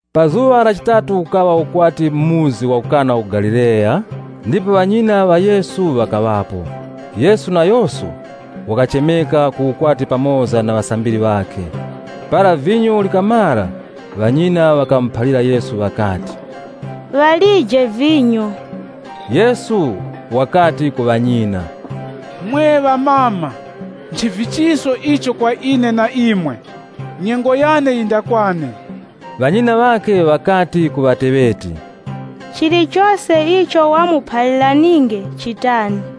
Pa zuŵa la chitatu kukaŵa ukwati mu muzi wa ku Kana mu Galileya ndipo ŵanyina ŵa Yesu ŵakaŵapo. Yesu nayoso wakachemeka ku ukwati pamoza na ŵasambiri ŵakhe. Para vinyo likamara, ŵanyina ŵakamuphalira Yesu ŵakati, “Ŵalije vinyo.” Yesu wakati ku ŵanyina, “Mwe amama, nchivichiso ichi kwa ine na imwe? Nyengo yane yindakwane.” Ŵanyina ŵakhe ŵakati ku ŵateŵeti, “Chilichose icho wamuphaliraninge chitani.”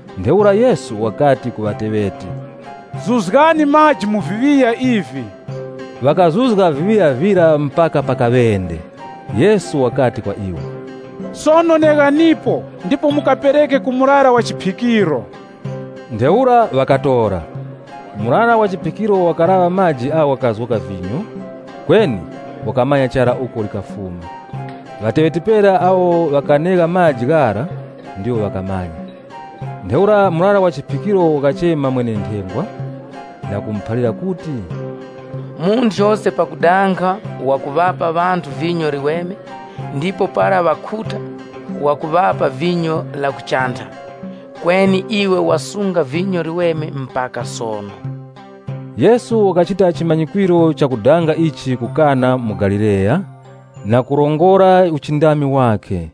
Ntheura Yesu wakati ku ŵateŵeti, “Zuzgani maji mu viŵiya ivi.” Ŵakazuzga viŵiya vira mpaka pa kaŵende. Yesu wakati kwa iwo, “Sono neghanipo ndipo mukapereke ku murara wa chiphikiro.” Ntheura ŵakatora. Murara wa chiphikiro wakalaŵa maji agho ghakazgoka vinyo, kweni wakamanya chara uko likafuma. (Ŵateŵeti pera awo ŵakanegha maji ghara ndiwo ŵakamanya.) Ntheura murara wa chiphikiro wakachema mwene-nthengwa, na kumuphalira kuti, “Munthu yose pakudanga wakuŵapa ŵanthu vinyo liweme, ndipo para ŵakhuta, wakuŵapa vinyo ilo ndiheni. Kweni iwe wasunga vinyo liweme mpaka sono.” Yesu wakachita chimanyikwiro chakudanga ichi ku Kana mu Galileya, na kurongora uchindami wakhe,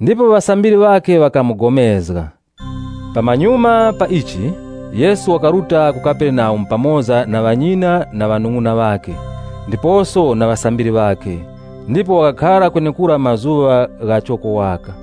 ndipo ŵasambiri ŵakhe ŵakapulikana nayo. Pamanyuma pa ichi, Yesu wakaruta ku Kaperenaumu pamoza na ŵanyina na ŵanung'una ŵakhe, ndiposo na ŵasambiri ŵakhe, ndipo ŵakakhara kwenekura mazuŵa ghachoko waka.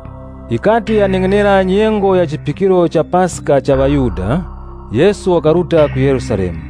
Yikati yaneng'enera nyengo ya chiphikiro cha Paska la ŵaYuda, Yesu wakaruta ku Yerusalemu.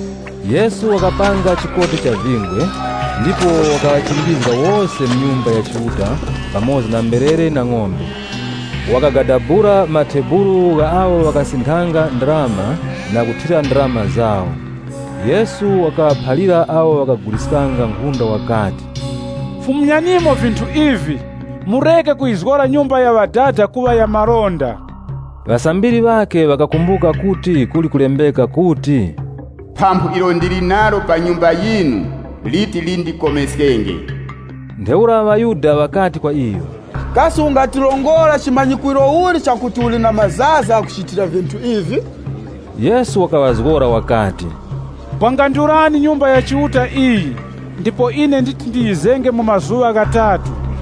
Yesu wakapanga chikoti cha vingwe, ndipo wakaŵachimbizga wose mu Nyumba ya Chiuta pamoza na mberere na ng'ombe. Wakagadabula matebulu gha awo ŵakasinthanga ndarama na kuthira ndarama zawo. Yesu wakaŵaphalira awo ŵakaguliskanga nkhunda wakati, “Fumyanimo vinthu ivi. Mureke kuyizgora nyumba ya Ŵadada kuŵa ya malonda.” Ŵasambiri ŵakhe ŵakakumbuka kuti kuli kulembeka kuti, “Phamphu ilo ndili nalo pa nyumba yinu, liti lindikome.” Ntheura ŵaYuda ŵakati kwa iyo, “Kasi ungatirongora chimanyikwiro uli chakuti uli na mazaza ghakuchitira vinthu ivi?” Yesu wakaŵazgora wakati, “Bwangandulani Nyumba ya Chiuta iyi, ndipo ine nditi ndiyizenge mu mazuŵa ghatatu.”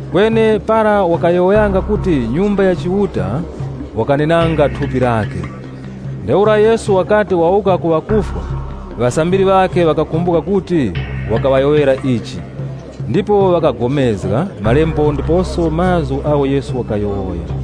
Kweni para wakayowoyanga kuti Nyumba ya Chiuta, wakanenanga thupi lakhe. Ntheura Yesu wakati wawuka ku ŵakufwa, ŵasambiri ŵakhe wakakumbuka kuti wakaŵayowoyera ichi. Ndipo ŵakapulikana na malembo ndiposo na mazgu agho Yesu wakayowoya.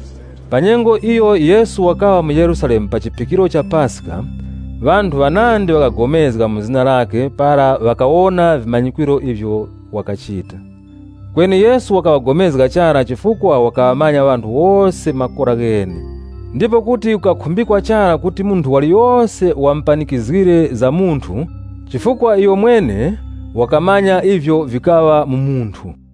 Pa nyengo iyo Yesu wakaŵa mu Yerusalemu pa chiphikiro cha Paska, ŵanthu ŵanandi ŵakapulikana mu zina lakhe para ŵakawona vimanyikwiro ivyo wakachita. Kweni Yesu wakaŵagomezga chara, chifukwa wakaŵamanya ŵanthu wose makora ghene. Ndipo kuti kukakhumbikwa chara kuti munthu waliyose wamupanikizgire za munthu chifukwa iyomwene wakamanya ivyo vikaŵa mu munthu.